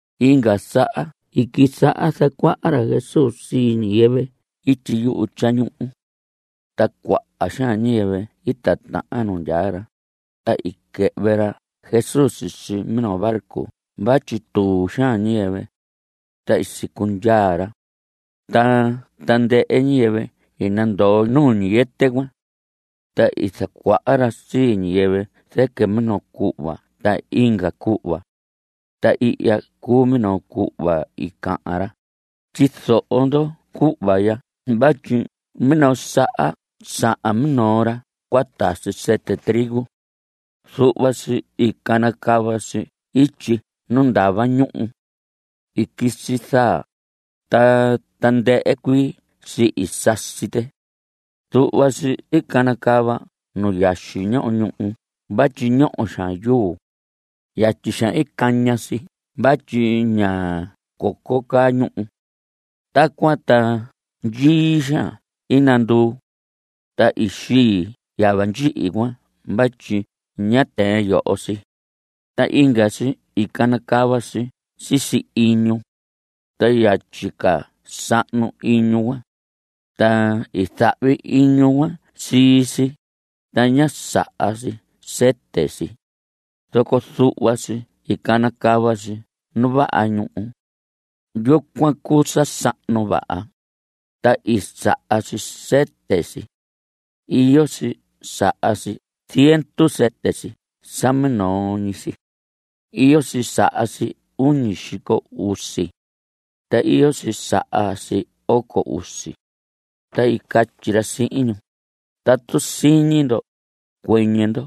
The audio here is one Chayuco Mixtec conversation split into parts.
Inga saha i quisaha zacuaha ra Jesús sii ñiyɨvɨ ityi yuhu tyañuhu. Ta cuaha xaan ñiyɨvɨ i titahan nu ndyaa ra, ta i quɨhvɨ ra Jesús sisi minoo barco vatyi tuu xaan ñiyɨvɨ. Ta i sicundyaa ra. Ta tandɨhɨ ñiyɨvɨ i nandoo nuu ñiyɨtɨ cuan. Ta i zacuaha ra sii ñiyɨvɨ zɨquɨ minoo cuhva ta inga cuhva. Ta ihya cuu minoo cuhva i cahan ra: Tyizoho ndo cuhva ya vatyi minoo saha sahan minoo ra cua tasi sɨtɨ trigo. Zuhva si i canacava si ityi nu ndava ñuhu. I quisi zaa, ta tandɨhɨ cuii si i sasi tɨ. Zuhva si i canacava nu yaxi ñoho ñuhu vatyi ñoho xaan yuu. Yatyi xaan i caña si vatyi ña coco caa ñuhu. Tacuan ta ndyii xaan i nanduu. Ta i xii yava ndyihi cuan vatyi ñá tɨɨn yoho si. Ta inga si i canacava si sisi iñu. Ta yatyi ca sahnu iñu cuan. Ta i zahvi iñu cuan sii si, ta ñá saha si sɨtɨ si. Zoco zuhva si i canacava si nu vaha ñuhu. Yucuan cuu sa sahnu vaha. Ta i saha si sɨtɨ si. Iyo si saha si ziendu sɨtɨ si sa minoo ñi si. Iyo si saha si uñi xico usi. Ta iyo si saha si oco usi. Ta i catyi ra sihin ñu: Tatu siñi ndo, ¡cuɨñɨ ndo!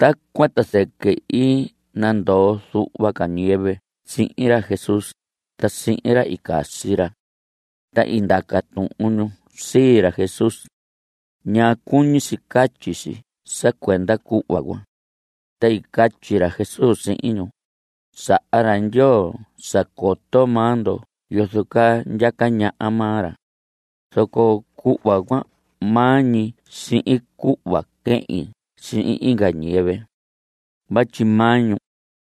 Tacuan ta zɨquɨ i nandoo zuhva ca ñiyɨvɨ sihin ra Jesús ta sihin ra i casi ra. Ta i ndaca tuhun ñu sii ra Jesús: ¿Ñaa cuñi si catyi si sa cuenda cuhva cuan? Ta i catyi ra Jesús sihin ñu: Saha ra Ndyoo sa coto maa ndo yozo caa ndyaca ñaha maa ra. Zoco cuhva cuan maa ñi sihin cuhva quehin sihin inga ñiyɨvɨ. Vatyi maa ñu,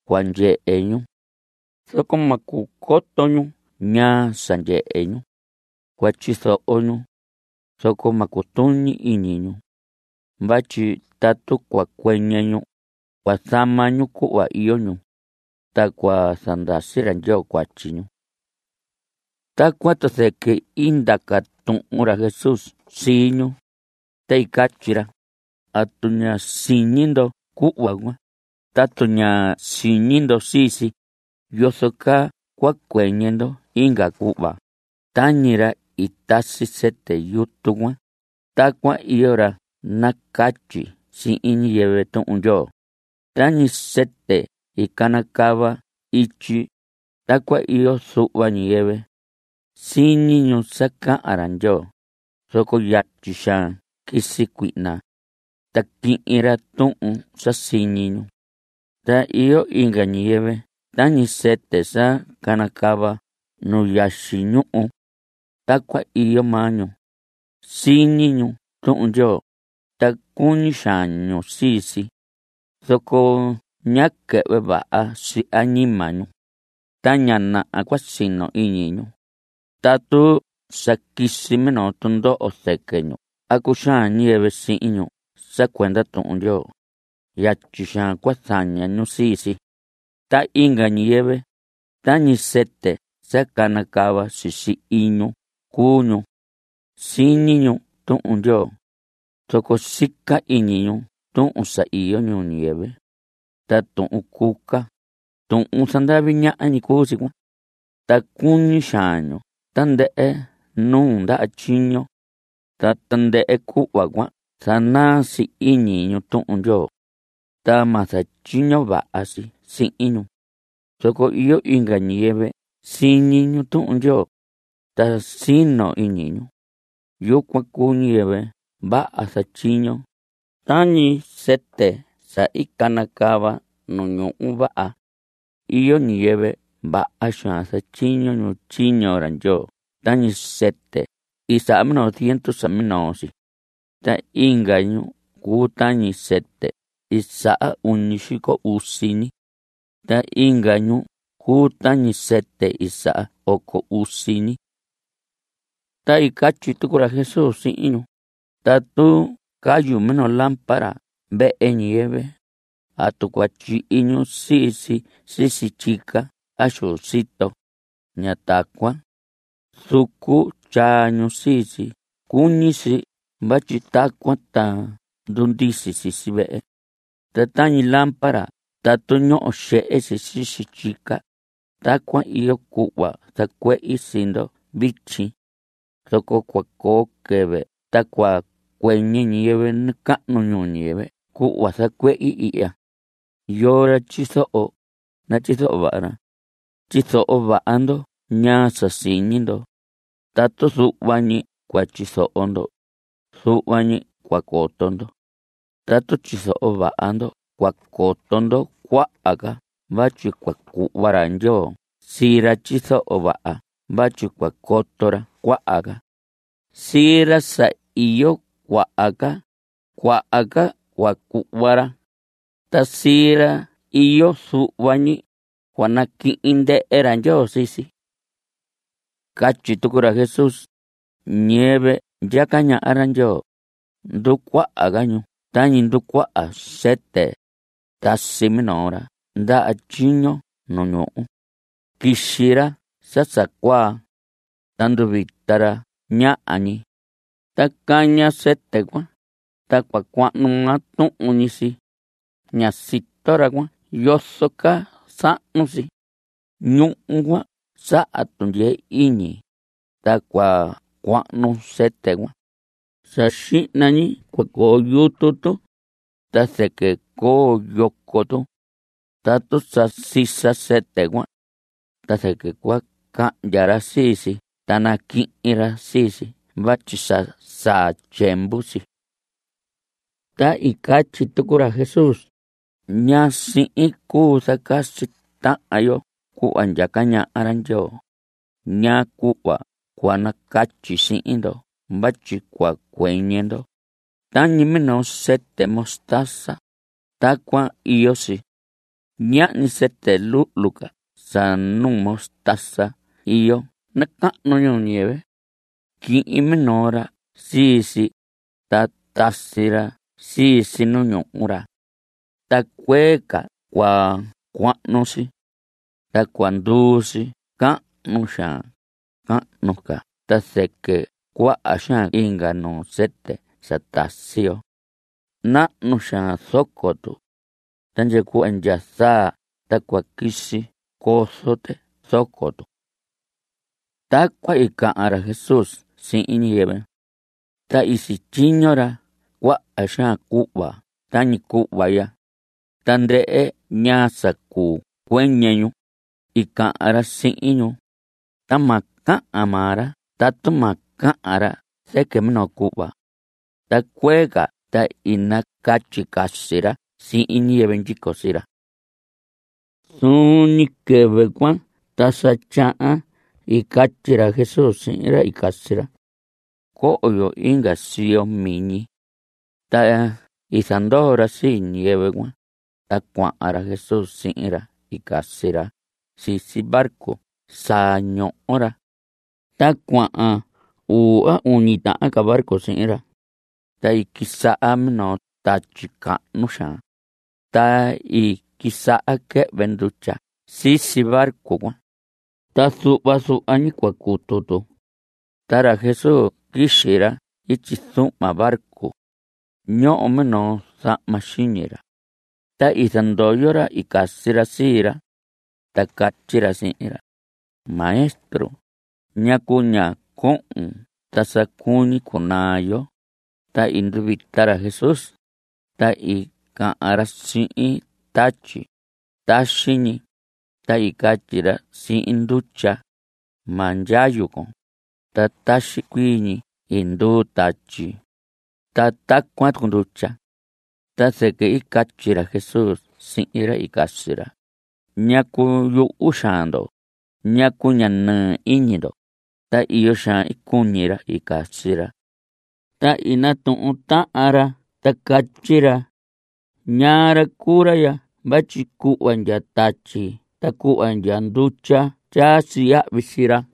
cua ndyehe ñu. Zoco ma cuu coto ñu ñaa sa ndyehe ñu. Cua tyizoho ñu. Zoco ma cutuñi iñi ñu. Vatyi tatu cua cuɨñɨ ñu, cua zama ñu cuhva iyo ñu. Ta cua zandasi ra Ndyoo cuatyi ñu. Tacuan ta zɨquɨ i ndaca tuhun ra Jesús sii ñu. Ta i catyi ra: ¿Atu ña siñi ndo cuhva cuan? Tatu ña siñi ndo sii si, ¿yozo caa cua cuɨñɨ ndo inga cuhva? Tañi ra i tasi sɨtɨ yutu cuan, tacuan iyo ra nacatyi sihin ñiyɨvɨ Tuhun Ndyoo. Tañi sɨtɨ i canacava ityi, tacuan iyo zuhva ñiyɨvɨ. Siñi ñu sa cahan ra Ndyoo, zoco yatyi xaan quisi cuihna. Ta quihin ra tuhun sa siñi ñu. Ta iyo inga ñiyɨvɨ tañi sɨtɨ sa canacava nu yaxi ñuhu. Tacuan iyo maa ñu. Siñi ñu Tuhun Ndyoo, ta cuñi xaan ñu sii si. Zoco ña quɨhvɨ vaha si añima ñu. Ta ña naha cua sino iñi ñu. Tatu sa quisi minoo tundoho zɨquɨ ñu a cuxaan ñiyɨvɨ sihin ñu sa cuenda Tuhun Ndyoo, yatyi xaan cua zaña ñu sii si. Ta inga ñiyɨvɨ, tañi sɨtɨ sa canacava sisi iñu cuu ñu. Siñi ñu Tuhun Ndyoo. Zoco sica iñi ñu tuhun sa iyo ñuu ñiyɨvɨ. Ta tuhun cuca, tuhun zandavi ñaha ñi cuu si cuan. Ta cuñi xaan ñu tandɨhɨ nuu ndaha tyiño. Ta tandɨhɨ cuhva cuan zanaa si iñi ñu Tuhun Ndyoo. Ta ma zatyiño vaha si sihin ñu. Zoco iyo inga ñiyɨvɨ siñi ñu Tuhun Ndyoo. Ta sino iñu ñu. Yucuan cuu ñiyɨvɨ vaha zatyiño, tañi sɨtɨ sa i canacava nu ñuhu vaha. Iyo ñiyɨvɨ vaha xaan zatyiño ñu tyiño ra Ndyoo tañi sɨtɨ i saha minoo ziendu sa minoo si. Ta inga ñu cuu tañi sɨtɨ i saha uñi xico usi ñi. Ta inga ñu cuu tañi sɨtɨ i saha oco usi ñi. Ta i catyi tucu ra Jesús sihin ñu: Tatu cayu minoo lámpara vehe ñiyɨvɨ, ¿atu cua tyihi ñu sii si sisi tyica a xu sito? Ña tacuan. Zucu tyaa ñu sii si cuñi si vatyi tacuan ta ndundisi sisi vehe. Ta tañi lámpara tatu ñoho xehe si sisi tyica, tacuan iyo cuhva zacuehi sii ndo vityi. Zoco cua coo quɨvɨ ta cua cuɨñɨ ñiyɨvɨ nacahnu ñuu ñiyɨvɨ cuhva zacuehi ihya. Yoo ra tyizoho, natyizoho vaha ra. Tyizoho vaha ndo ñaa sa siñi ndo. Tatu zuhva ñi cua tyizoho ndo, zuhva ñi cua coto ndo. Tatu tyizoho vaha ndo cua coto ndo cuaha ca vatyi cua cuhva ra Ndyoo sii ra tyizoho vaha vatyi cua coto ra cuaha ca. Sii ra sa iyo cuaha ca, cuaha ca cua cuhva ra. Ta sii ra iyo zuhva ñi, cua naquihin ndɨhɨ ra Ndyoo sii si. Catyi tucu ra Jesús: Ñiyɨvɨ ndyaca ñaha ra Ndyoo, nducuaha ca ñu tañi nducuaha sɨtɨ. Tasi minoo ra ndaha tyiño nu ñuhu. Quixi ra sa sa cuaa. Ta nduvita ra ñaha ñi. Ta caña sɨtɨ cuan, ta cua cuahnu maa tuhun ñi si. Ña sito ra cuan yozo caa sahnu si. Ñuhu cuan saha tundyee iñi, ta cua cuahnu sɨtɨ cuan. Sa xihna ñi cua coo yutu tu. Ta zɨquɨ coo yoco tu. Tatu sa sisa sɨtɨ cuan. Ta zɨquɨ cua cahndya ra sii si ta naquihin ra sii si vatyi sa saa tyiemvu si. Ta i catyi tucu ra Jesús: ¿Ñaa sihin cuu zacasi tahan yo cuhva ndyaca ñaha ra Ndyoo? ¿Ñaa cuhva cua nacatyi sihin ndo vatyi cua cuɨñɨ ndo? Tañi minoo sɨtɨ mostaza, tacuan iyo si. Ñahñi sɨtɨ luhlu ca sa nuu mostaza iyo nacahnu ñuu ñiyɨvɨ. Quihin minoo ra sii si, ta tasi ra sii si nu ñuhu ra. Ta cuee ca cua cuahnu si. Ta cua nduu si cahnu xaan, cahnu ca ta zɨquɨ cuaha xaan inga nuu sɨtɨ sa tasi yo. Nahnu xaan zoco tu. Ta ndya cuhva ndya zaa ta cua quisi cozo tɨ zoco tu. Tacuan i cahan ra Jesús sihin ñiyɨvɨ. Ta i sityiño ra cuaha xaan cuhva tañi cuhva ya. Tandɨhɨ ñaa sa cuu cuɨñɨ ñu, i cahan ra sihin ñu. Ta ma cahan maa ra tatu ma cahan ra zɨquɨ minoo cuhva. Ta cuee ca ta i nacatyi casi ra sihin ñiyɨvɨ ndyico sii ra. Zuun ñi quɨvɨ cuan ta sa tyahan i catyi ra Jesús sihin ra i casi ra: Coho yo inga siyo miñi. Ta i zandoo ra sii ñiyɨvɨ cuan, ta cuahan ra Jesús sihin ra i casi ra sisi barco sa ñoho ra. Ta cuahan uu a uñi tahan ca barco sihin ra. Ta i quisaha minoo tatyi cahnu xaan. Ta i quisaha quɨhvɨ ndutya sisi barco cuan. Ta zuhva zuhva ñi cua cutu tu. Ta ra Jesús quixi ra ityi zuhma barco. Ñoho minoo zahma xiñi ra. Ta i zandoyo ra i casi ra sii ra. Ta catyi ra sihin ra: Maestro, ¿ñacu ña cohon ta sa cuñi cunaa yo? Ta i nduvita ra Jesús, ta i cahan ra sihin tatyi: ¡Taxi ñi! Ta i catyi ra sihin ndutya: ¡Ma ndyayu con! Ta taxi cuii ñi i nduu tatyi. Ta tacuan tucu ndutya. Ta zɨquɨ i catyi ra Jesús sihin ra i casi ra: ¿Ñacu yuhu xaan ndo? ¿Ñacu ña nɨɨ iñi ndo? Ta iyo xaan i cuñi ra i casi ra. Ta i natuhun tahan ra, ta catyi ra: ¿Ñaa ra cuu ra ya vatyi cuhva ndya tatyi ta cuhva ndya ndutya ta tyaa si yahvi sii ra?